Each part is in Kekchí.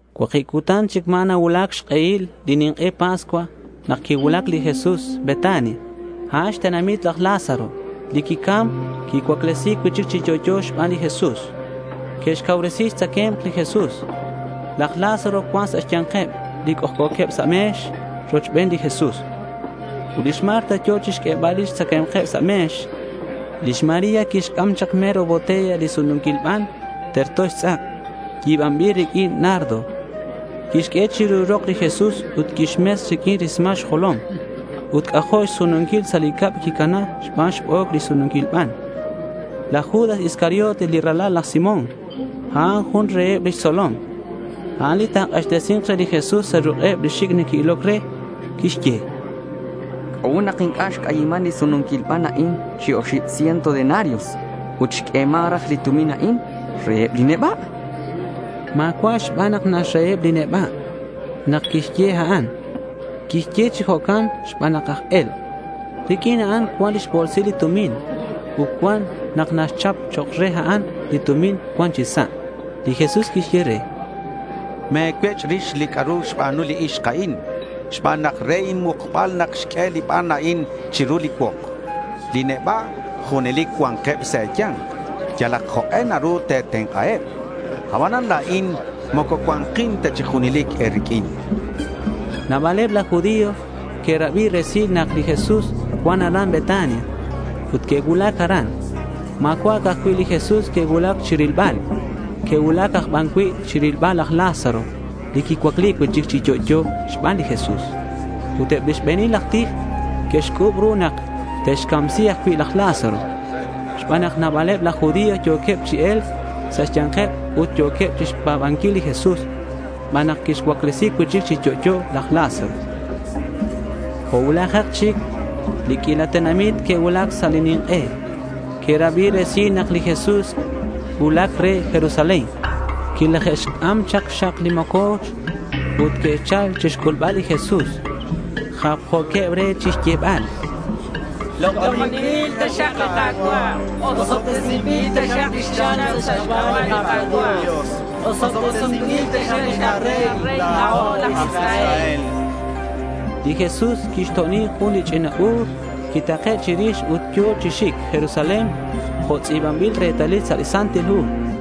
Cuakib cutan chic ma̱ nacuulac xk'ehil li nink'e Pascua nak quicuulac li Jesús Betania. A'an xtenamit laj Lázaro, li quicam ut quicuaclesi̱c cui'chic chi yo'yo xban li Jesús. Que'xcauresi xtzacae̱mk li Jesús. Laj Lázaro cuan sa' xya̱nkeb li c'ojc'o̱queb sa' me̱x rochben li Jesús. Ut lix Marta yo̱ chixq'uebal li tzacae̱mk sa' li me̱x. Lix María quixc'am chak mero botella li sununquil ban terto xtz'ak yi̱banbil riq'uin nardo. Quixq'ue chiru rok li Jesús ut quixmes riq'uin li rismal xjolom. Ut c'ajo' xsununquil sa' li cab quicana xban xbo̱c li sununquil ban. Laj Judas Iscariote li ralal laj Simón, a'an jun reheb lix tzolom. A'an li ta̱k'axtesi̱nk re li Jesús sa' ruk'eb li xic' neque'iloc re. Quixye: —¿C'a'ut nak inc'a' xc'ayiman li sununquil ban a'in chi oxib ciento denarios ut xq'ueman raj li tumin a'an reheb li neba'? chan. Ma̱cua' xban nak naxraheb li neba' nak quixye a'an. Quixye chi jo'can xban nak aj e̱lk'. Riq'uin a'an cuan lix bo̱lsil li tumin ut cuan nak naxchap chok' re a'an li tumin cuan chi sa'. Li Jesús quixye re: —Me̱cuech' rix li c'a'ru xba̱nu li ixk a'in, xban nak re inmukbal nak xq'ue li ban a'in chiru li cuok. Li neba' junelic cua̱nkeb sa' e̱ya̱nk. Yalak jok'e naru te̱tenk'aheb. Abanan la̱in moco cua̱nkin ta chi junelic e̱riq'uin, chan li Jesús. Nabaleb laj judío que'rabi resil nak li Jesús cuan aran Betania ut que'cuulac aran. Ma̱cua' ca'aj cui' li Jesús que'cuulac chirilbal. Que'cuulac aj ban cui' chirilbal laj Lázaro li quicuaclesi̱c cui'chic chi yo'yo xban li Jesús. Ut eb li xbe̱nil aj tij que'xc'u̱b ru nak te'xcamsi ajcui' laj Lázaro, xban nak nabaleb laj judío yo̱queb chi e̱lc sa' xya̱nkeb ut yo̱queb chixpa̱banquil li Jesús xban nak quixcuaclesi cui'chic chi yo'yo laj Lázaro. Jo' cuulajak chic li q'uila tenamit que'cuulac sa' li nink'e. Que'rabi resil nak li Jesús cuulac re Jerusalén. Quilaje'xc'am chak xxak li moco̱ch ut que'chal chixc'ulbal li Jesús. Japjo̱queb re chixyebal: —Lok'oninbil taxak li Ka̱cua'. Osobtesinbil taxak li xchal sa' xc'aba' li Ka̱cua' Dios. Osobtesinbil taxak li karey, la̱o aj Israel, chanqueb. Li Jesús quixto'oni jun li ch'ina bu̱r, quitake' chirix ut yo̱ chi xic Jerusalén jo' tz'i̱banbil retalil sa' li Santil Hu: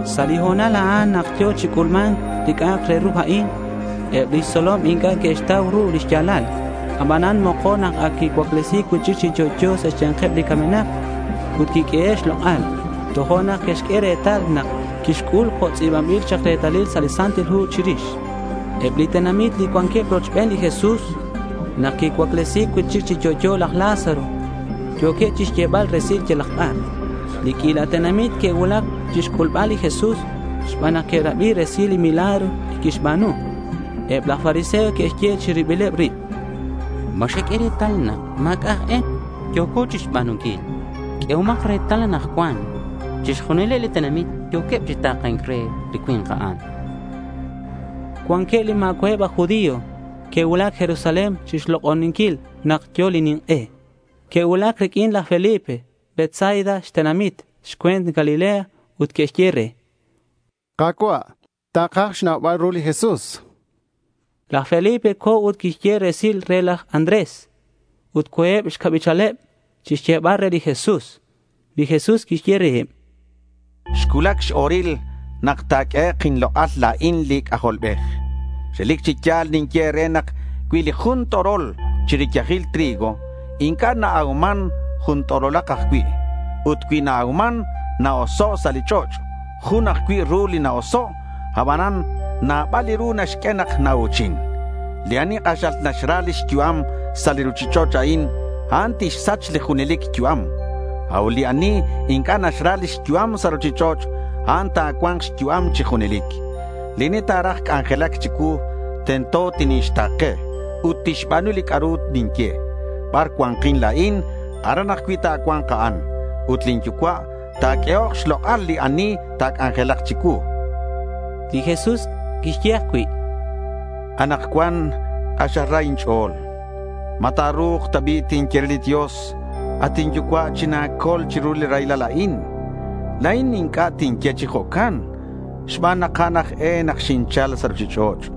Sa' li ho̱nal a'an nak yo̱ chi c'ulma̱nc li c'a'ak re ru a'in, eb lix tzolom inc'a' que'xtau ru li xya̱lal. Abanan mokon nak ac quicuaclesi̱c cui'chic chi yo'yo sa' xya̱nkeb li camenak ut quiq'uehe' xlok'al, tojo'nak que'xq'ue retal nak quixc'ul jo' tz'i̱banbil chak retalil sa' li Santil Hu chirix. Eb li tenamit li cuanqueb rochben li Jesús nak quixcuaclesi cui'chic chi yo'yo laj Lázaro yo̱queb chixyebal resilal yalak bar. Li q'uila tenamit que'cuulac chixc'ulbal li Jesús xban nak que'rabi resil li milagro li quixba̱nu. Eb laj fariseo que'xye chi ribileb rib: —¿Ma xeq'ue retal nak ma̱c'a' aj e li yo̱co chixba̱nunquil? Q'uehomak retal. Anakcuan chixjunileb li tenamit yo̱queb chi ta̱ke̱nc re li cui̱nk a'an, chanqueb. Cuanqueb li ma̱cua'eb aj judío que'cuulac Jerusalén chi lok'oni̱nc nak yo̱ li nink'e. Que'cuulac riq'uin laj Felipe Betsaida xtenamit xcue̱nt Galilea ut que'xye re: —Ka̱cua', takaj xnaubal ru li Jesús, chanqueb. Laj Felipe co̱ ut quixye resil re laj Andrés ut co̱eb xcabichaleb chixyebal re li Jesús. Li Jesús quixye reheb: —Xcuulac x-o̱ril nak ta̱q'uehek' inlok'al la̱in li C'ajolbej. Relic chi ya̱l ninye e̱re nak cui li jun t'orol chi riyajil trigo inc'a' na-auman, jun t'orolak ajcui'. Ut cui na-auman, na-oso' sa' li ch'och'. Jun ajcui' ru li na-oso', abanan nabal li ru naxq'ue nak nau̱chin. Li ani k'axal naxra lix yu'am sa' li ruchich'och' a'in, a'an tixsach li junelic yu'am. A'ut li ani inc'a' naxra lix yu'am sa' ruchich'och', a'an ta̱cua̱nk xyu'am chi junelic. Li ani ta̱raj c'anjelac chicuu, tento tinixta̱ke ut tixba̱nu li c'a'ru ninye. Bar cua̱nkin la̱in, aran ajcui' ta̱cua̱nk a'an. Ut lin Yucua' ta̱q'uehok xlok'al li ani ta̱c'anjelak chicuu, chan li Jesús reheb. Li Jesús quixye ajcui': —Anakcuan k'axal ra sa' inch'o̱l. ¿Ma ta̱ru̱k ta bi' tinye re li Dios, “At inYucua', china̱col chiru li raylal a'in”? La̱in inc'a' tinye chi jo'can xban nak a'an aj e nak xinchal sa' ruchich'och'.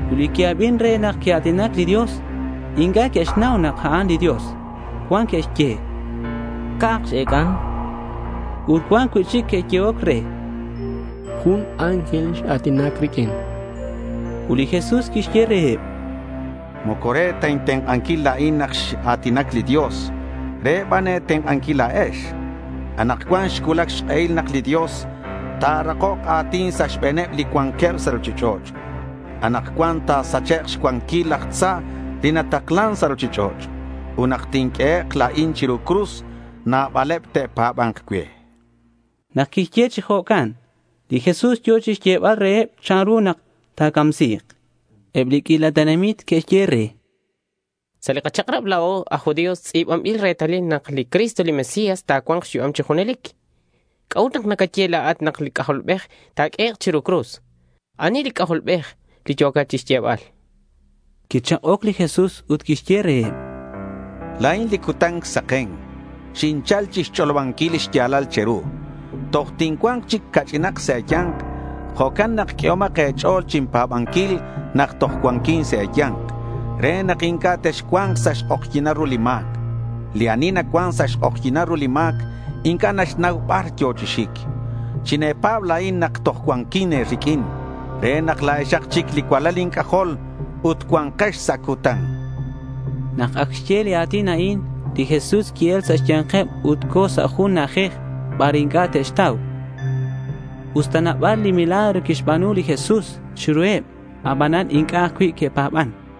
Ut li que'abin re nak quia̱tinac li Dios inc'a' que'xnau nak a'an li Dios. Cuan que'xye: —Ca̱k x-ec'an, chanqueb. Ut cuan cui'chic que'yehoc re: —Jun ángel x-a̱tinac riq'uin, chanqueb. Ut li Jesús quixye reheb: —Moco re ta intenk'anquil la̱in nak x-a̱tinac li Dios. Re ban e̱tenk'anquil la̱ex. Anakcuan xcuulac xk'ehil nak li Dios ta̱rakok a̱tin sa' xbe̱neb li cuanqueb sa' ruchich'och'. Anakcuan ta̱sachek' xcuanquil laj tza li nataklan sa' ruchich'och'. Ut nak tinq'uehek' la̱in chiru cruz, nabaleb te'pa̱ba̱nk cue, chan. Nak quixye chi jo'can, li Jesús yo̱ chixyebal reheb chanru nak ta̱camsi̱k. Eb li q'uila tenamit que'xye re: —Sa' li kachak'rab la̱o aj judío tz'i̱banbil retalil nak li Cristo li Mesías ta̱cua̱nk xyu'am chi junelic. ¿C'a'ut nak nacaye la̱at nak li C'ajolbej ta̱q'uehek' chiru cruz? ¿Ani li C'ajolbej li yo̱cat chixyebal? chanqueb. Quichak'oc li Jesús ut quixye reheb: —La̱in li cutan saken. Xinchal chixch'olobanquil li xya̱lal che̱ru. Toj tincua̱nk chic ca'ch'inak sa' e̱ya̱nk. Jo'can nak q'uehomak e̱ch'o̱l chinpa̱banquil nak toj cuanquin sa' e̱ya̱nk re nak inc'a' texcua̱nk sa' xk'ojyi̱nal ru li ma̱c. Li ani nacuan sa' xk'ojyi̱nal ru li ma̱c inc'a' naxnau bar yo̱ chi xic. Chine̱pa̱b la̱in nak toj cuanquin e̱riq'uin re nak la̱exak chic li cualal inc'ajol ut cua̱nkex sa' cutan, chan li Jesús. Nak ac xye li a̱tin a'in, li Jesús qui-el sa' xya̱nkeb ut co̱ sa' jun na'ajej bar inc'a' te'xtau. Usta nabal li milagro quixba̱nu li Jesús chiruheb, abanan inc'a' ajcui' que'pa̱ban.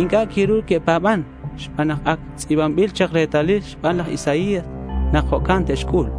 Inc'a' quiru que'pa̱ban xban nak ac tz'i̱banbil chak retalil xban laj Isaías nak jo'can te'xc'ul.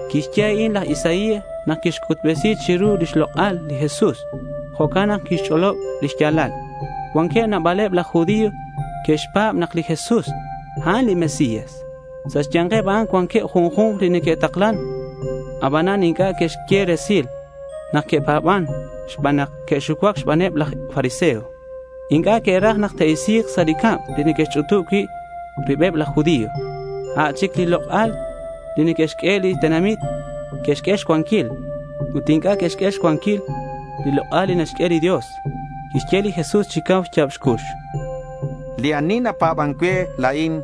Quixye a'in laj Isaías nak quic'utbesi̱c chiru lix lok'al li Jesús. Jo'can nak quixch'olob li xya̱lal. Cuanqueb nabaleb laj judío que'xpa̱b nak li Jesús, a'an li Mesías. Sa' xya̱nkeb a'an cuanqueb junju̱nk li neque'taklan. Abanan inc'a' que'xye resil nak que'pa̱ban xban nak que'xucuac xbaneb laj fariseo. Inc'a' que'raj nak te'isi̱k sa' li cab li neque'xch'utub cui' ribeb laj judío. A' chic li lok'al li neque'xq'ue li tenamit que'xq'ue xcuanquil. Ut inc'a' que'xq'ue xcuanquil li lok'al li naxq'ue li Dios. Quixye li Jesús chi cau xya̱b xcux: —Li ani napa̱ban cue la̱in,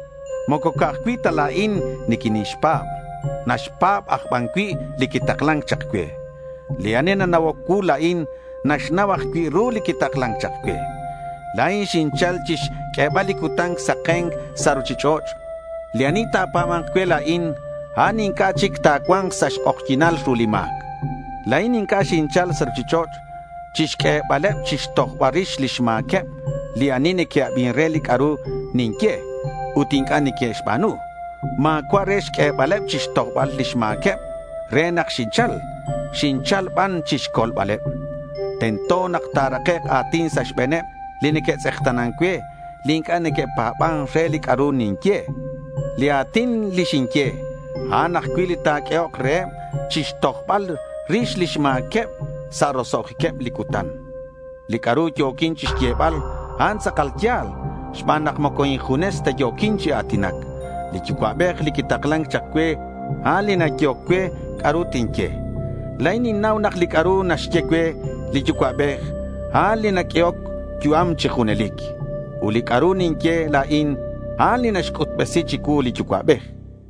moco ca'aj cui' ta la̱in niquinixpa̱b. Naxpa̱b aj ban cui' li quitaklan chak cue. Li ani nana'oc cuu la̱in, naxnau ajcui' ru li quitaklan chak cue. La̱in xinchal chixq'uebal li cutan saken sa' ruchich'och'. Li ani ta̱pa̱ba̱nk cue la̱in, a'an inc'a' chic ta̱cua̱nk sa' xk'ojyi̱nal ru li ma̱c. La̱in inc'a' xinchal sa' ruchich'och' chixq'uebaleb chixtojbal rix lix ma̱queb li ani neque'abin re li c'a'ru ninye ut inc'a' neque'xba̱nu. Ma̱cua' re xq'uebaleb chixtojbal lix ma̱queb nak xinchal. Xinchal ban chixcolbaleb. Tento nak ta̱rakek' a̱tin sa' xbe̱neb li neque'tz'ekta̱nan cue, li inc'a' neque'pa̱ban re li c'a'ru ninye. Li a̱tin li xinye, a'an ajcui' li ta̱q'uehok reheb chixtojbal rix lix ma̱queb sa' roso'jiqueb li cutan. Li c'a'ru yo̱quin chixyebal, a'an tz'akal ya̱l xban nak moco injunes ta yo̱quin chi a̱tinac. Li Yucua'bej li quitaklan chak cue, a'an li nayehoc cue c'a'ru tinye. La̱in ninnau nak li c'a'ru naxye cue li Yucua'bej, a'an li naq'uehoc yu'am chi junelic. Ut li c'a'ru ninye la̱in, a'an li naxc'utbesi chicuu li Yucua'bej.